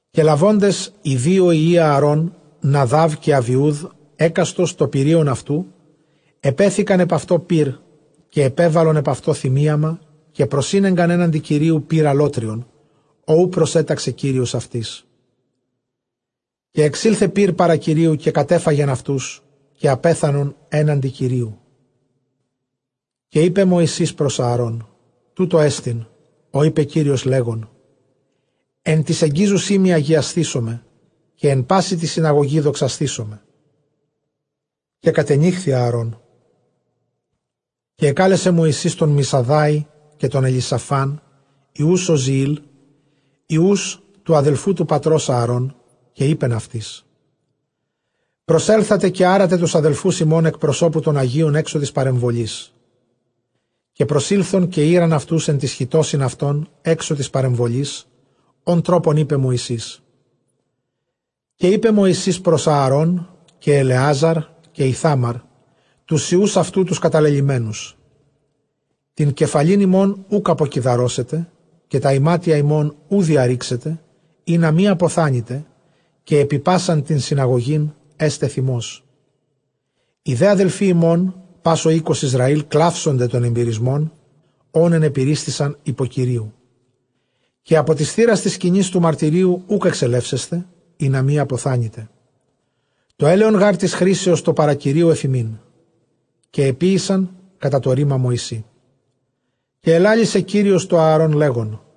Καὶ λαβόντες οἱ δύο υἱοὶ Ἀαρὼν Ναδὰβ καὶ Ἀβιοὺδ, ἕκαστος τὸ πυρεῖον αὐτοῦ, ἐπέθηκαν ἐπʼ αὐτὸ πῦρ, καὶ ἐπέβαλον ἐπʼ αὐτὸ θυμίαμα, καὶ προσήνεγκαν ἔναντι Κυρίου πῦρ ἀλλότριον, ὃ οὐ προσέταξε Κύριος αὐτοῖς. Καὶ ἐξῆλθε πῦρ παρὰ Κυρίου, καὶ κατέφαγεν αὐτοὺς, καὶ ἀπέθανον ἔναντι Κυρίου. Καὶ εἶπε Μωυσῆς πρὸς Ἀαρὼν, τοῦτό ἐστιν, ὃ εἶπε Κύριος, λέγων, ἐν τοῖς ἐγγίζουσί μοι ἁγιασθήσομαι, καὶ ἐν πάσῃ τῇ συναγωγῇ δοξασθήοσμαι· καὶ κατενύχθη Ἀαρών. Καὶ ἐκάλεσε Μωυσῆς τὸν Μισαδάη, καὶ τὸν Ἐλισαφὰν, υἱοὺς Ὀζιὴλ, υἱοὺς τοῦ ἀδελφοῦ τοῦ πατρὸς Ἀαρὼν, καὶ εἶπεν αὐτοῖς, προσέλθατε καὶ ἄρατε τοὺς ἀδελφοὺς ὑμῶν ἐκ προσώπου τῶν ἁγίων ἔξω τῆς παρεμβολῆς. Καὶ προσῆλθον, καὶ ᾖραν αὐτοὺς ἐν τοῖς χιτῶσιν αὐτῶν ἔξω τῆς παρεμβολῆς, ὃν τρόπον εἶπε Μωυσῆς. Καὶ εἶπε Μωυσῆς πρὸς Ἀαρὼν καὶ Ἐλεάζαρ καὶ Ἰθάμαρ τοὺς υἱοὺς αὐτοῦ τοὺς καταλελειμμένους, τὴν κεφαλὴν ὑμῶν οὐκ ἀποκιδαρώσετε, καὶ τὰ ἱμάτια ὑμῶν οὐ διαῤῥήξετε, ἵνα μὴ ἀποθάνητε, καὶ ἐπὶ πᾶσαν τὴν συναγωγὴν ἔσται θυμός· οἱ δὲ ἀδελφοὶ ὑμῶν, πᾶς ὁ οἶκος Ἰσραὴλ, κλαύσονται τὸν ἐμπυρισμὸν, ὃν ἐνεπυρίσθησαν ὑπὸ Κυρίου. Καὶ ἀπὸ τὴς θύρας τῆς σκηνῆς τοῦ μαρτυρίου οὐκ ἐξελεύσεσθε, ἵνα μὴ ἀποθάνητε· τὸ ἔλαιον γὰρ τῆς χρίσεως, τὸ παρὰ Κυρίου, ἐφʼ ὑμῖν, καὶ ἐποίησαν κατὰ τὸ ῥῆμα Μωυσῆ. Καὶ ἐλάλησε Κύριος τῷ Ἀαρὼν, λέγων,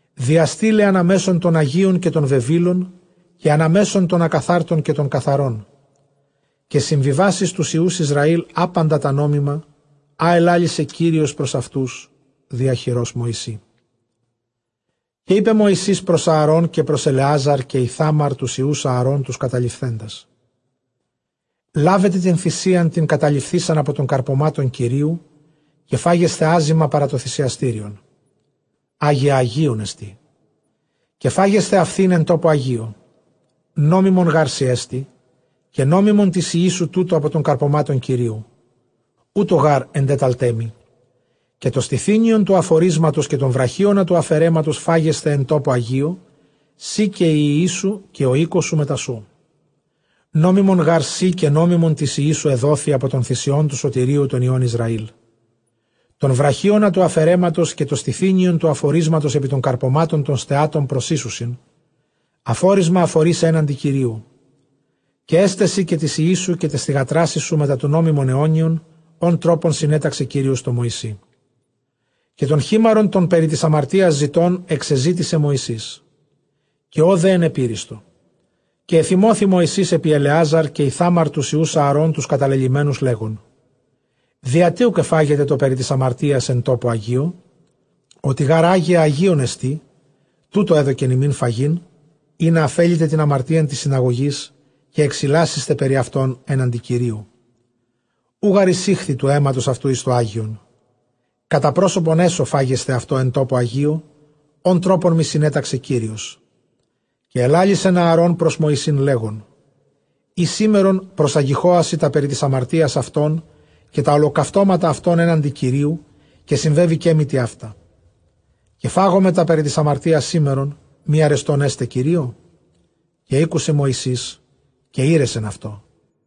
διαστεῖλαι ἀναμέσον τῶν ἁγίων καὶ τῶν βεβήλων, καὶ ἀναμέσον τῶν ἀκαθάρτων καὶ τῶν καθαρῶν, καὶ συμβιβάξειν τοὺς υἱοὺς Ἰσραὴλ ἅπαντα τὰ νόμιμα, ἃ ἐλάλησε Κύριος πρὸς αὐτοὺς διὰ χειρὸς Μωυσῆ. Καὶ εἶπε Μωυσῆς πρὸς Ἀαρὼν καὶ πρὸς Ἐλεάζαρ καὶ Ἰθάμαρ τοὺς υἱοὺς Ἀαρὼν τοὺς καταλειφθέντας, λάβετε τὴν θυσίαν τὴν καταλειφθεῖσαν ἀπὸ τῶν καρπωμάτων Κυρίου, καὶ φάγεσθε ἄζυμα παρὰ τὸ θυσιαστήριον· ἅγια ἁγίων ἐστί. Καὶ φάγεσθε αὐτὴν ἐν τόπῳ ἁγίῳ· νόμιμον γάρ σοι ἐστὶ, καὶ νόμιμον τοῖς υἱοῖς σου τοῦτο ἀπὸ τῶν καρπωμάτων Κυρίου· οὕτω γὰρ ἐντέταλταί μοι. Καὶ τὸ στηθύνιον τοῦ ἀφορίσματος, καὶ τὸν βραχίονα τοῦ ἀφαιρέματος φάγεσθε ἐν τόπῳ ἁγίῳ, σὺ καὶ οἱ υἱοί σου καὶ ὁ οἶκός σου μετὰ σοῦ· νόμιμον γὰρ σοι, καὶ νόμιμον τοῖς υἱοῖς σου ἐδόθη ἀπὸ τῶν θυσιῶν τοῦ σωτηρίου τῶν υἱῶν Ἰσραήλ. Τὸν βραχίονα τοῦ ἀφαιρέματος, καὶ τὸ στηθύνιον τοῦ ἀφορίσματος ἐπὶ τῶν καρπωμάτων τῶν στεάτωι· προσοίσουσιν ἀφόρισμα ἀφορίσαι ἔναντι Κυρίου· καὶ ἔσται σοι καὶ τοῖς υἱοῖς σου καὶ ταῖς θυγατράσι σου μετὰ σοῦ νόμιμον αἰώνιον, ὃν τρόπον συνέταξε Κύριος τῷ Μωυσῇ. Καὶ τὸν χίμαρον τὸν περὶ τῆς ἁμαρτίας ζητῶν ἐξεζήτησε Μωυσῆς· καὶ ὁ δὲ ἐνπεπύριστο· καὶ ἐθυμώθη Μωυσῆς ἐπὶ Ἐλεάζαρ καὶ Ἰθάμαρ τοὺς υἱοὺς Ἀαρὼν τοὺς καταλελειμμένους, λέγων, διατί οὐκ ἐφάγετε τὸ περὶ τῆς ἁμαρτίας ἐν τόπῳ ἁγίῳ; ὅτι γὰρ ἅγια ἁγίων ἐστι, τοῦτο ἔδωκεν ὑμῖν φαγεῖν, ἵνα ἀφέλητε τὴν ἁμαρτίαν τῆς συναγωγῆς, καὶ ἐξιλάσησθε περὶ αὐτῶν ἔναντι Κυρίου. Οὐ γὰρ εἰσήχθη τοῦ αἵματος αὐτοῦ εἰς τὸ ἅγιον· κατὰ πρόσωπον ἔσω φάγεσθε αὐτὸ ἐν τόπῳ ἁγίῳ, ὃν τρόπον μοι συνέταξε Κύριος. Καὶ ἐλάλησεν Ἀαρὼν πρὸς Μωυσῆν, λέγων, εἰ σήμερον προσαγιόχασι τὰ περὶ τῆς ἁμαρτίας αὐτῶν, καὶ τὰ ὁλοκαυτώματα αὐτῶν ἔναντι Κυρίου, καὶ συμβέβηκέ μοι τοιαῦτα, καὶ φάγομαι τὰ περὶ τῆς ἁμαρτίας σήμερον, μὴ ἀρεστὸν ἔται Κυρίῳ; Καὶ ἤκουσε Μωυσῆς, καὶ ἤρεσεν αὐτῷ.